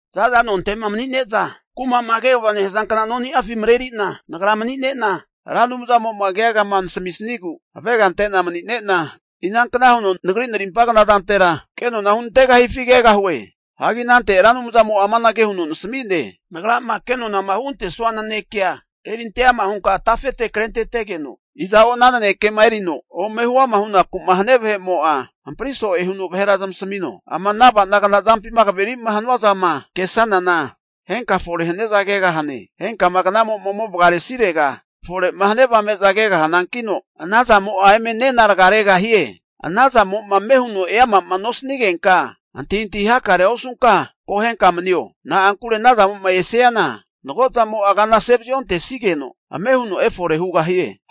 Za'za nonte'ma mani'neza kumama kegava nehazankna noni'afi mareri'na nagra manine'na, Ra Anumzamo'ma keagama nasamisnigu avega ante'na mani'nena, inankna huno nagri narimpa knazantera kenona hunantegahifi kegahue. Hagi anante Ra Anumzamo'a amanage huno nasami'ne, Nagrama ke nonama hugantesanua nanekea erinte ama hunka tafete krentetegeno, iza'o ana nanekema erino ome huama hunaku'ma hania vahe'mo'a, hampri so'e huno vahera zamasamino. Ama ava'nagna zampima kaveri'ma hanua zama kesanana, henka fore haniaza kegahane. Henkama knamo'ma ome vagaresirega fore'ma hania avame'za kegahanankino, ana zamo'a eme nena raga regahie. Anazamo'ma ame huno eama'ma nosanigenka, antahintahi hakarea osunka akohenka manio. Na'ankure ana zamo'ma esiana mago'zamo'a kana ase vaziontesigeno ame huno efore hugahie.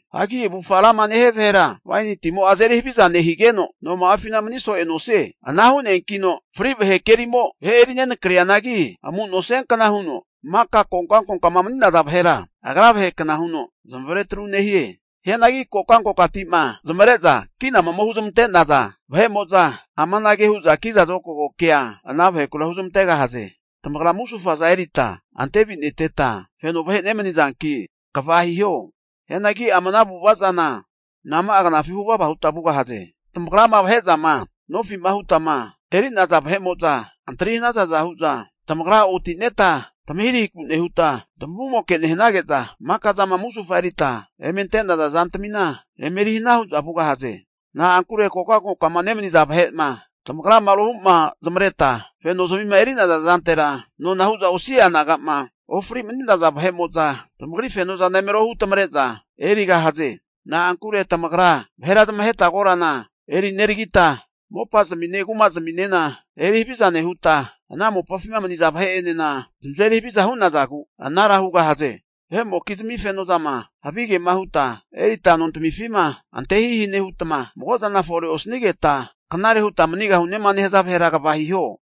Hanki avufga rama nehia vahera waini timo'a azeri haviza nehigeno, noma'afina mani so'ea nosie. Ana hu'neankino fri vahe kerimo vahe eri nenakrianagi amu nosiankna huno maka kokankokama mani'naza vahera, agra vahekna huno zamavare tru nehie. Hianagi kokankokati'ma zamavare'zama kinama ome huzmante'naza vahe'mo'za amanage hu'za kiza zokago kea ana vahekura huzmantegahaze, tamagra musufaza erita antevineteta feno vahe nemanizanki, kva hiho. Hianagi ama ana avu'ava zana nama'a knafi huvava huta vugahaze? Tamagrama vahe zama nofi'ma hutma eri'naza vahe'mo'za antri hanazaza hu'za, tamagra oti'neta tamahirahiku nehuta tamavumoke nehanage'za, maka zama musufama erita eme ante'naza zantamina eme eri hana hu'za vugahaze. Na'ankure kokankokama nemaniza vahe'ma tamagrama rohu'ma zamareta fenozamima eri'naza zantera, nona hu'za osi'a naga'ma ofri mani'naza vahe'mo'za tamagri fenozana eme rohu tamare'za erigahaze. Na'ankure tamagra vahera zamaheta korana eri neragita, mopazmine kumazminena eri haviza nehuta, ana mopafima maniza vahe'enena zamazeri haviza hu'nazagu anara hugahaze. Vahe'mokizmi fenozama havigema huta erita nontamifima ante hihi nehutma, magozana fore osanigeta knare huta manigahunema nehaza vahera kva hiho.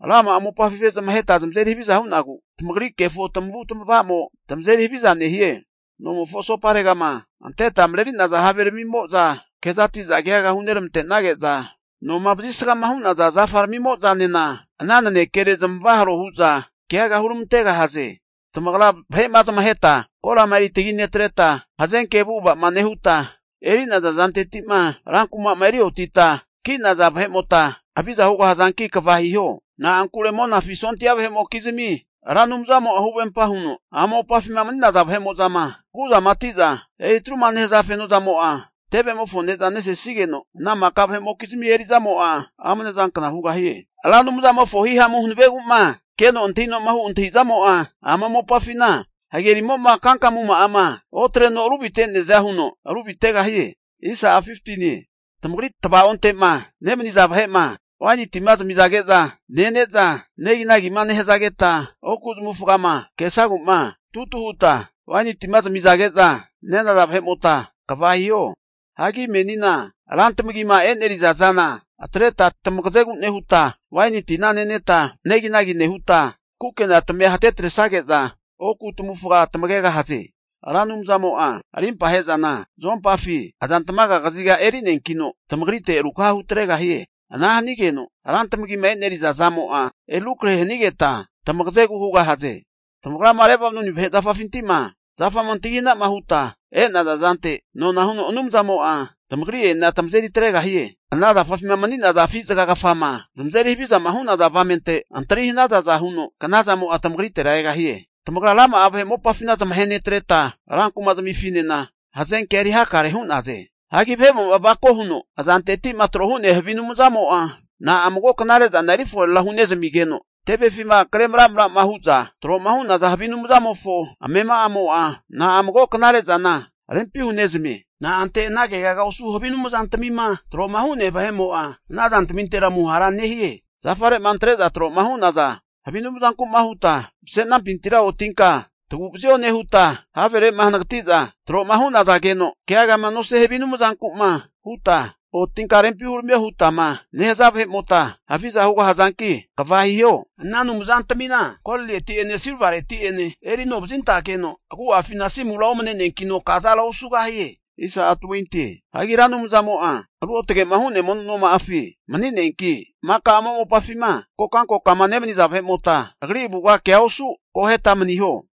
Rama'a mopafi vahe zamaheta zamazeri haviza hu'nagu, tamagri kefo tamavu tamavamo tamazeri haviza nehie. Nomofo asoparegama anteta mareri'naza haveramimo'za kezatiza keaga huneramante'nage'za, noma vazisgama hu'naza zafa ramimo'zanena ana nanekere zamavaharo hu'za keaga huramantegahaze. Tamagra vahe'ma zamaheta korama eri taginetreta, hazenke avu'ava'ma nehuta, eri'naza zanteti'ma ran kuma'ma eri otita ki'naza vahe'mota haviza hugahazanki, kva hiho. Na'ankure Monafi sondia vahe'mokizmi Ra Anumzamo'a huvempa huno, ama mopafima mani'naza vahe'mo'zama maraguzamati'za eri atru'ma nehaza feno zamo'a, tevemofo ne'za nesenigeno, ana maka vahe'mokizmi eri'zamo'a amne zankna hugahie. Ra Anumzamofo hihamu hanavegu'ma keno antahinoma hu antahizamo'a, ama mopafina hagerimo'ma kankamuma'ama otreno ruvite'neaza huno ruvitegahie. Tamagri tvaonte'ma nemaniza vahe'ma waini tima zamizage'za nene'za neginagima nehazageta, oku zamavufagama kesagu'ma tutu huta waini tima zamizage'za nenaza vahe'mota, kva hiho. Hagi menina ran tamagima e'neriza zana atreta tamagazegu nehuta, waini tina neneta neginagi nehuta, kukena tamia hate atresage'za, oku tamavufga tamagegahaze. Ra Anumzamo'a arimpa ahe'zana zuompafi azantmaga kaziga eri'neankino, tamagrite rukaha hutregahie. Ana hanigeno ran tamagima e'neriza zamo'a eri rukrahe hanigeta tamagazegu hugahaze. Tamagrama Lebanoni vahe zafafinti'ma zafama antagi hana'ma huta e'naza zante, nona huno Anumzamo'a tamagri'enena tamazeri atregahie. Ana zafafima mani'naza afi zaga kafama zamazeri havizama hu'naza avamente, antri hanazaza huno knazamo'a tamagritera egahie. Tamagra rama'a vahe mopafina zamahe netreta, ran kuma zamifinena hazenkea eri hakare hu'naze. Hagi vahemo'ma avako huno azanteti'ma tro hu'nea havi anumzamo'a, na'a mago knare zana eri forera hunezamigeno, tevefima kre maramrama hu'za tro'ma hu'naza havi anumzamofo amema'amo'a na'a mago knare zana rempi hunezamie? Na'ante ana kegaga osu havi anumzantamima tro'ma hu'nea vahe'mo'a ana zantamintera amuhara nehie? Zafare'ma antre'za tro'ma hu'naza havi anumzanku'ma huta, mase'nampintira otinka tagu'vazio nehuta, havere'ma hanagati'za tro'ma hu'nazageno keagama nosia havi anumzanku'ma huta, otinka rempi huramio hutama nehaza vahe'mota, haviza hugahazanki, kva hiho. Ana anumzantamina golireti'ene silvareti'ene eri ano vazintageno, agu'afina asimura omane'neankino kazara osugahie. Hianagi Ra Anumzamo'a ruotage'ma hu'nea mono noma'afi mani'neanki, maka ama mopafima kokankokama nemaniza vahe'mota Agri avuga kea osu akoheta maniho.